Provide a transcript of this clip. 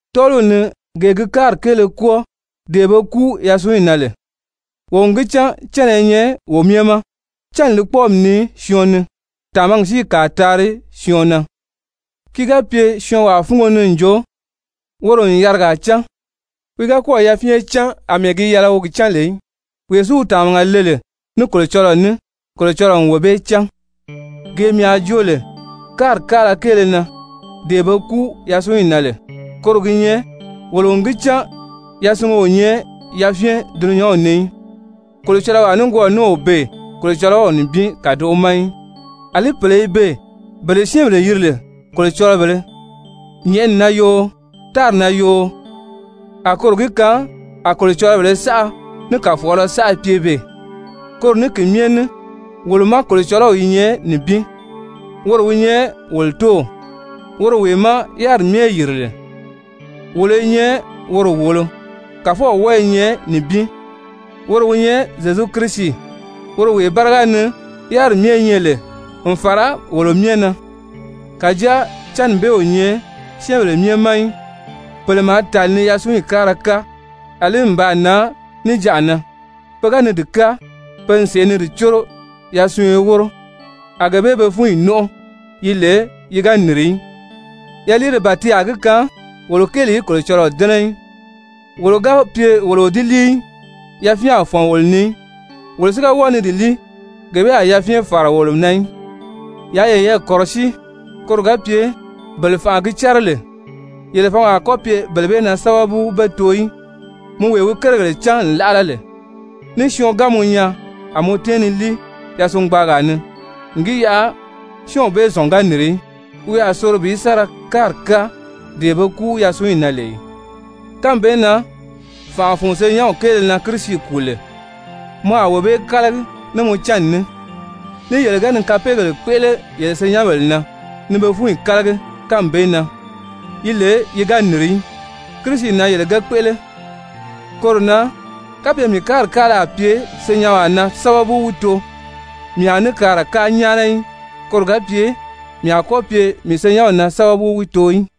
Tɔ́ɔliw ni gee gi káari kéele kwɔ́ɔ dee be kúu yasunyi na lè, wo n gi cán cánna i nyɛ wo myɛ ma. Cánni li kpɔ́ɔmi nii syɔɔn ni, tàmagi si i kàa taari syɔɔn na. Ki ga pye syɔɔnwaa fúngo ni n jo woro n yarigaa cán, wi ga kɔ́ɔ̀ yafyɛn cán àmɛɛ gi yɛlɛ wi gi cán lè í. Wee si wi tàmaga le lè ní Kolocɔlɔɔ ní, Kolocɔlɔɔ n wee bee cán. Gee mii a joo lè káari káala kéele na, dee be kúu yasunyi na lè koro gi nyɛ wolo n gi cán yasungo o nyɛ yafyɛn dulunyanw ni í, kolocɔlɔwaa nikwɔɔ ní o beè Kolocɔlɔw nibin kàdoʔo ma í. Alí pèle i beè bele syɛ́ɛnbèle yiri lè kolocɔlɔbèlē, nyɛ̀ʔɛni na yoo, tári na yoo, a koro gi kaan a kolocɔlɔbèlē saʔa ní kàfɔɔlɔ saʔa pye beè, koro ní ki myɛ ní wolo má, Kolocɔlɔɔ i nyɛ nibin, woro wi nyɛ wolo Tóow, woro wee má yáriri myɛ yìri lè, wolo i nyɛ woro wòolo, Kàfɔw wɔ́ɔ i nyɛ nibin, woro wi nyɛ Zyezu Kirisi, woro wee báriga ni yáriri myɛ nyɛ lè n fàra wolo myɛ na. Kàjáa cánni bee o nyɛ syɛ́ɛnbèle myɛ ma í. Pèle maa tàli ni yasunyi káara káa, àlí n baa nan níjanʔa na pe ga ni di káa, pe n sèʔé ni di córo yasunyo wóro, a gee bee be fúnyi nɔ́nʔɔ, yi lè yi ga nìri í. Yaliire ban ti a gi kaan wolo kéeli í Kolocɔlɔɔ dɛ́nɛ í, wolo ga pye wolo o di líi í, yafyɛn a fɔ̀n wolo ni í. Wolo si ga wɔ́ɔ ni di líi, gee bee a yafyɛn fàra wolo na í. Yaa yeyɛɛ kɔ̀rɔsíi koro ga pye bele fànʔa gi cɛ́rɛ lè, yele fǎngi a kɔ́ pye bele bee na sábabu be too í. Mɔ wee wi kérigèle cán n láʔala lè, ní syɔɔn ga mɔ nyaa, a mɔ tɛ́ɛn ni líi yasungbaagaa ni n gi yaʔa syɔ́ɔnw bee zɔ̀n ga nìri í, wi a soro bi sa ra káari káa dee be kúu yasunyi na lè ì? Kánmi bee na fànʔa fun senyɛnw kéele na Kirisi kùu lè, mɔ a wee bee kálagi ní mɔ cánni ní. Ní yele ga ni kapeegèle kpéʔele yele senyɛnbèle na ni be fúnyi kálagi kánmi bee na, yi lè yi ga nìri í, Kirisi na yele ge kpéʔele. Koro na kapye mii káari káala a pye mii senyɛnwaa na sábabu wi too, mii a ní kaara káa nyáana í, koro ga pye mii a kɔ́ pye mii senyɛnw na sábabu wi too í.